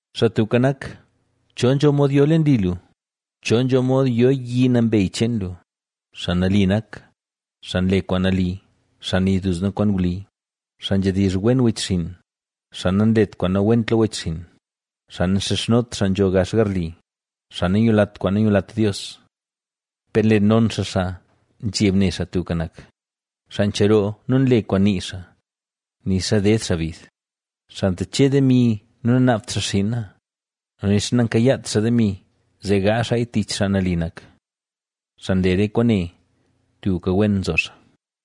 Xaa Tubka Nak, ¿Cho nzho mod yo leen li lu? ¿Cho nzho mod yo yi nambey cheen lu? Xaa nali nak, xaa nle kwaan nali, xaa nii duzna kwaan wli, xaa nzhedizh wen wechxinn, xaa nanlet kwaan nawent lo wechxinn, xaa nanxizhnot xaa nzho gax garli, xaa nanyulat kwaan nanyulat Dios, per nle non xaa xaa nzheb ne Xaa Tubka Nak, xaa ncheroo nu nle kwaan nii xaa, nixa ded xaa bid; xaa ntache demi nu nanaabt xaa xinna nu nixa nankayaat xaa demi, zee gaazh xaaya tich xaa nali nak. Xaa nle re kwaane, tubka wen nzo xaa.